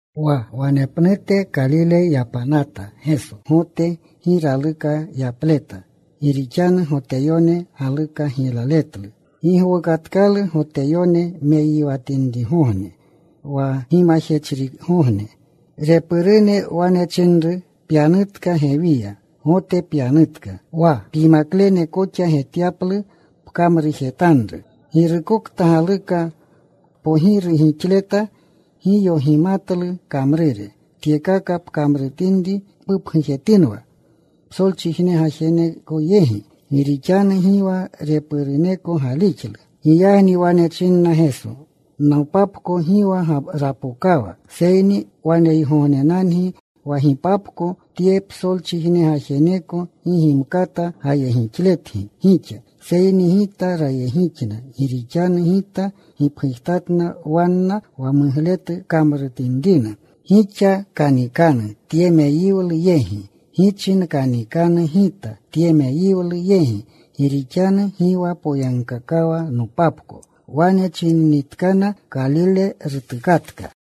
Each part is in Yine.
Wa wanepnute Kalile yapanata Geso. Gote gi raluka yapleta, gi rixanu Goteyone galuka giylaletlu. Gi gowukatkalu Goteyone meyiwatinrigogne, wa Gimajechrigogne. Repurune wane chinru, “Pyanutka gewiya. Gote pyanutka. Wa pyimaklene koxa getyaplu pkamrujetanru. Girukokta galuka kpogiru gixleta gi yogimatlu kamrure. Tyekaka pkamrutinri, pupgujetinwa psolchijne gajeneko yegi.” Gi rixanu gi wa repuruneko galixlu. Giyagni wane chinna Geso, “Nopapko gi wa rapokawa. Seyni waneygognenangi wa gipapko. Tye psolchijne gajeneko gi gimkata gayegixletgi gixa. Seyni Gita rayegixna. Gi rixanu Gita gipgujtatna wanna wa mugletu kamruretinrina. Gixa kanikanu tye meyiwlu yegi. Gichi nkanikanu Gita tye meyiwlu yegi. Gi rixanu gi wa poyagkaakawa nopapko.” Wane chininitkana, Kalile rutukatka.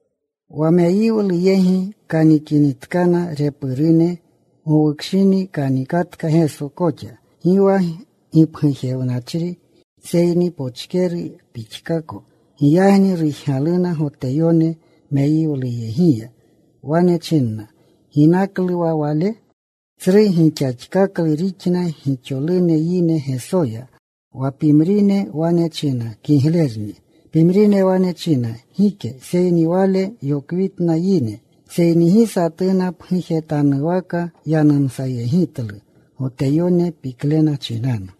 Wa meyiwlu yegi kanikinitkana repurune, gowukshini kanikatka Geso koxa. Gi wa gipgujewnachri, seyni pochkeru pixkako. Giyagni rujgaluna Goteyone meyiwluyegiya. Wane chinna, “¿Ginaklu wa Wale?” Tsru gixaxkaklu rixna gixolune yine Gesoya. Wa pimrine wane china, “Kiglerni.” Pimrine wane china, “Gike. Seyni Wale yokwitna yine.” Seyni gi satuna pgujetanwaka yanumsayegitlu Goteyone piklena chinanu.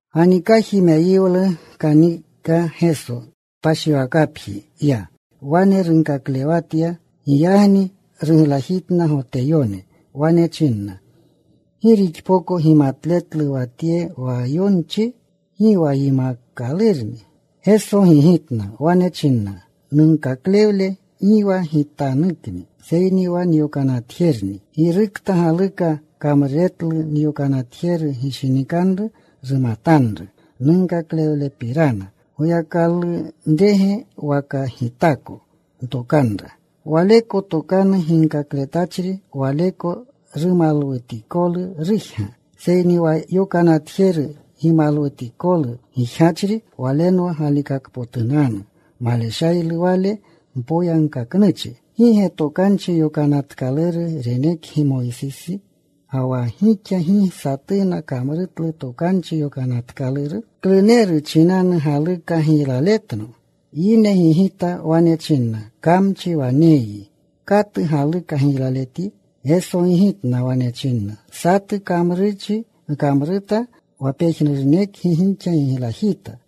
Ganikaji meyiwlu kanika Geso. Kpashiwakapji ya. Wane runkaklewatya. Giyagni ruglajitna Goteyone. Wane chinna, “¿Gi rixpoko gimatletlu wa Tye wa yonchi? Gi wa yimaakalurni.” Geso gigitna. Wane china, “Nunkaklewle gi wa Gitanukni, seyni wa nyokanatjerunni. Girukta galuka kamruretlu nyokanatjeru gishinikanru rumatanru nunkaklewlepirana, Goyakalunrege waka Gitako ntokanra. Waleko tokanu ginkakletachri, waleko rumalwutikolu rujga. Seyni wa yokanatjeru gimalwutikolu gijgachri, walenwa galikakpotunanu. Maleshaylu wale mpoyagkaknuchi. ¿Gi ge Tokanchi Yokanatkaluru renekgi Moysisi, ga wa gixa gi satuna kamrutlu Tokanchi Yokanatkaluru? ¿Kluneru chinanu galuka giylaletno?” Yine gigita. Wane chinna, “Kamchi waneyyi. ¿Katu galuka giylaletyi?” Geso gigitna. Wane chinna, “Satu kamrurchi nkamruta. Wa pejnurunekgi gixa giglajita.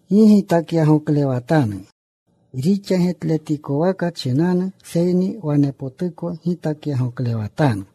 Gi gitakyagoklewatanu rixa getletikwaka chinanu, seyni wanepotuko gitakyagoklewatanu.”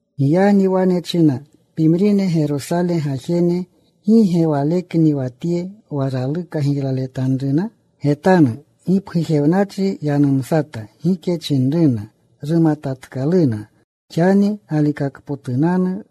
Giyagni wane chinna pimrine Gerosale gajene, “¿Gi ge Walekni wa Tye wa raluka giylaletanruna? Getanu. Gipgujewnachri yanumsata. Gike chinruna. ¿Rumatatkaluna xani galikakpotunanu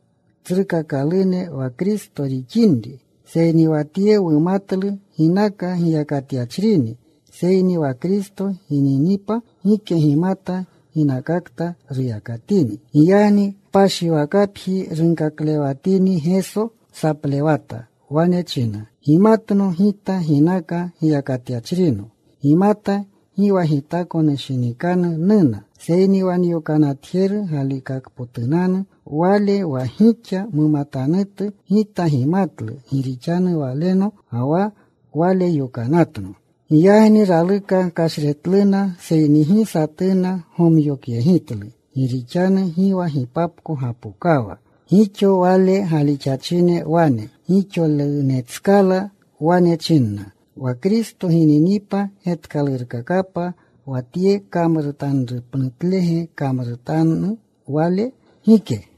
tsrukakalune wa Kristo rixinri? Seyni wa Tye wumatlu ginaka giyakatyachrini. Seyni wa Kristo gininipa gike gimata ginakakta ruyakatini.” Giyagni kpashiwakapji runkaklewanatini Geso, saplewata. Wane china, “Gimatno Gita. Ginaka giyakatyachrino gimata. Gi wa Gitako nushinikanu nuna. Seyni wa nyokanatjeru galikakpotunanni Wale, wa gixa mumatanutu. Gita gimatlu, gi rixanu Walenno. Ga wa Wale yokanatno.” Giyagni raluka kashretluna, seyni gi satuna gomyokyegitlu gi rixanu gi wa gipapko gapokawa. Gixo Wale galixachine wane gixolunetskala. Wane chinna, “¿Wa Kristo gininipa, getkalurkakapa wa Tye kamrutanrupnutlege kamrutanu Wale? Gike.”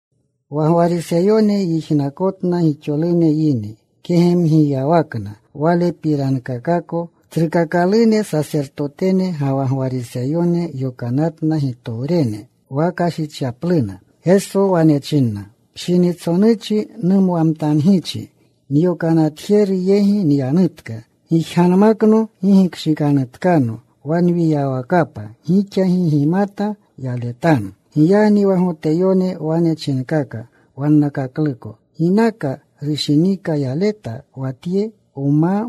Wa Gwariseyone yijnakotna gixolune yine kegemgiyawakna Walepirankakako. Tsrukakalune sasertotene ga wa Gwariseyone yokanatna gitowrenna wa kashichyapluna. Geso wane china, “Pshinitsonuchi numwamtangichi. Nyokanatjeru yegi nyanutka. Gijganmakno. Gi gikshikanutkano. Wa nwiyawakapa gixa gi gimkata yaletanu.” Giyagni wa Goteyone wane chinkaka wannakakluko, “¿Ginaka rushinika yaletge wa Tye wma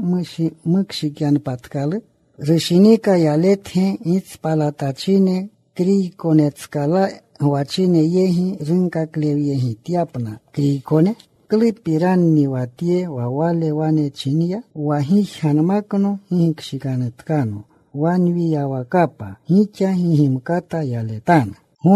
mukshikyanpatkalu? ¿Rushinika yaletge gitspalatachine, Kriykonetskala gwachine yegi, runkaklewyegityapna Kriykone? ¿Klupiranni wa tye wa Wale wane chinya? Wa, ‘Gijganmakno. Gi gikshikanutkano. Wa nwiyawakapa gixa gi gimkata yaletanu.’”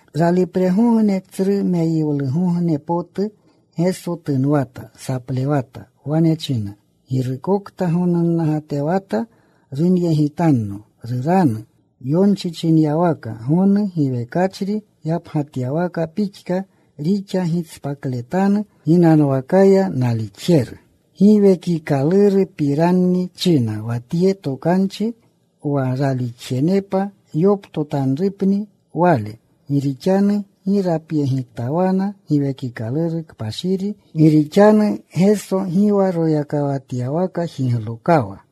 Ralipregogne, tsru meyiwlugogne potu, Geso tunwata. Saplewata. Wane china, “Girukokta gonunnagatewata runyegitanno. Ruranu. Yonchi chinyawaka, Gonu giwekachri yapgatyawaka pixka rixa gishpakletanu ginanwakaya nalixjeru.” Giwekikalurupiranni china wa tye tokanchi, wa ralixjenepa yoptotanrupni Wale. Gi rixanu gi rapyegitawana Giwekikaluru Kpashiri, gi rixanu Geso gi wa royakawatyawaka jiglokawa.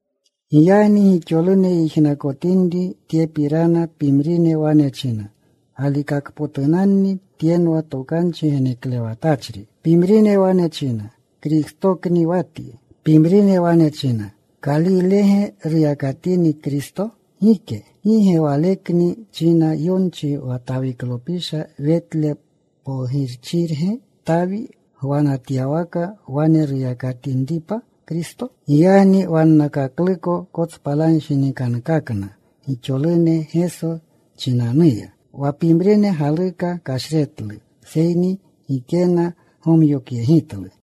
Giyagni gixolune yijnakotinri tyepirana, pimrine wane china, “Galikakpotunanni Tyenwa tokanchi geneklewatachri.” Pimrine wane china, “Kristokni wa Tye.” Pimrine wane china, “¿Kalilege ruyakatini Kristo? Gike. ¿Gi ge wanekni china yonchi wa Tawiklopisha, Wetle Pokchirge, Tawi gwanatyawaka, wane ruyakatinripa Kristo?” Giyagni wannakakluko kotspalanshinikankakna gixolune Geso chinanuya. Wa pimrine galuka kashretlu, seyni gikena gomyokyegitlu.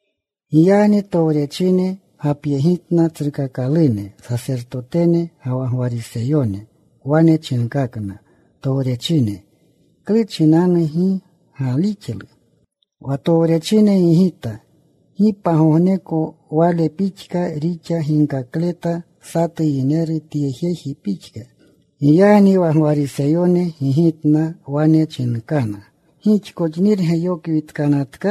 Giyagni towrechine gapyegitna tsrukakalune sasertotene ga wa Gwariseyone. Wane chinkana towrechine, “¿Klu chinanu gi ganiklu?” Wa towrechine gigita, “Gi pagogneko Wale pixka rixa ginkakleta satu yineru tye jeji pixka.” Giyagni wa Gwariseyone gigitna. Wane chinkana, “¿Gixkoxnirge yokwitkanatka?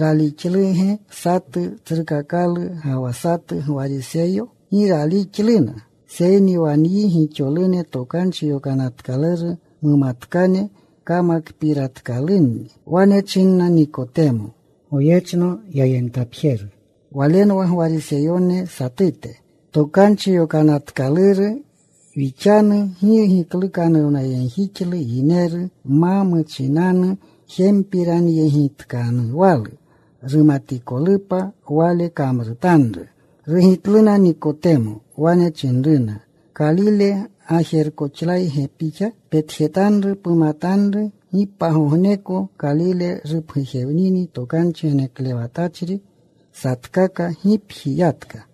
¿Ralixluge satu tsrukakalu, ga wa satu Gwariseyo? Gi ralixluna. Seyni wa nyi gixolune, Tokanchi Yokanatkaluru mumatkane, kamakpiratkalunni.” Wane chinna Nikotemo (Goyechno yayentapjeru. Walenwa Gwariseyone satute). “Tokanchi Yokanatkaluru wixanu gi giklukanuwnayegjixlu yineru ma muchinanu jempiranyegitkanuwalu, rumatikolupa wale kamrutanru.” Rugitluna Nikotema. Wane chinruna, “¿Kalile gajerkoxlayge pixa? Petjetanru. Pumatanru. Gi pagogneko Kalile rupgujewnini tokanchi geneklewatachri.” Satkaka gipji yatka.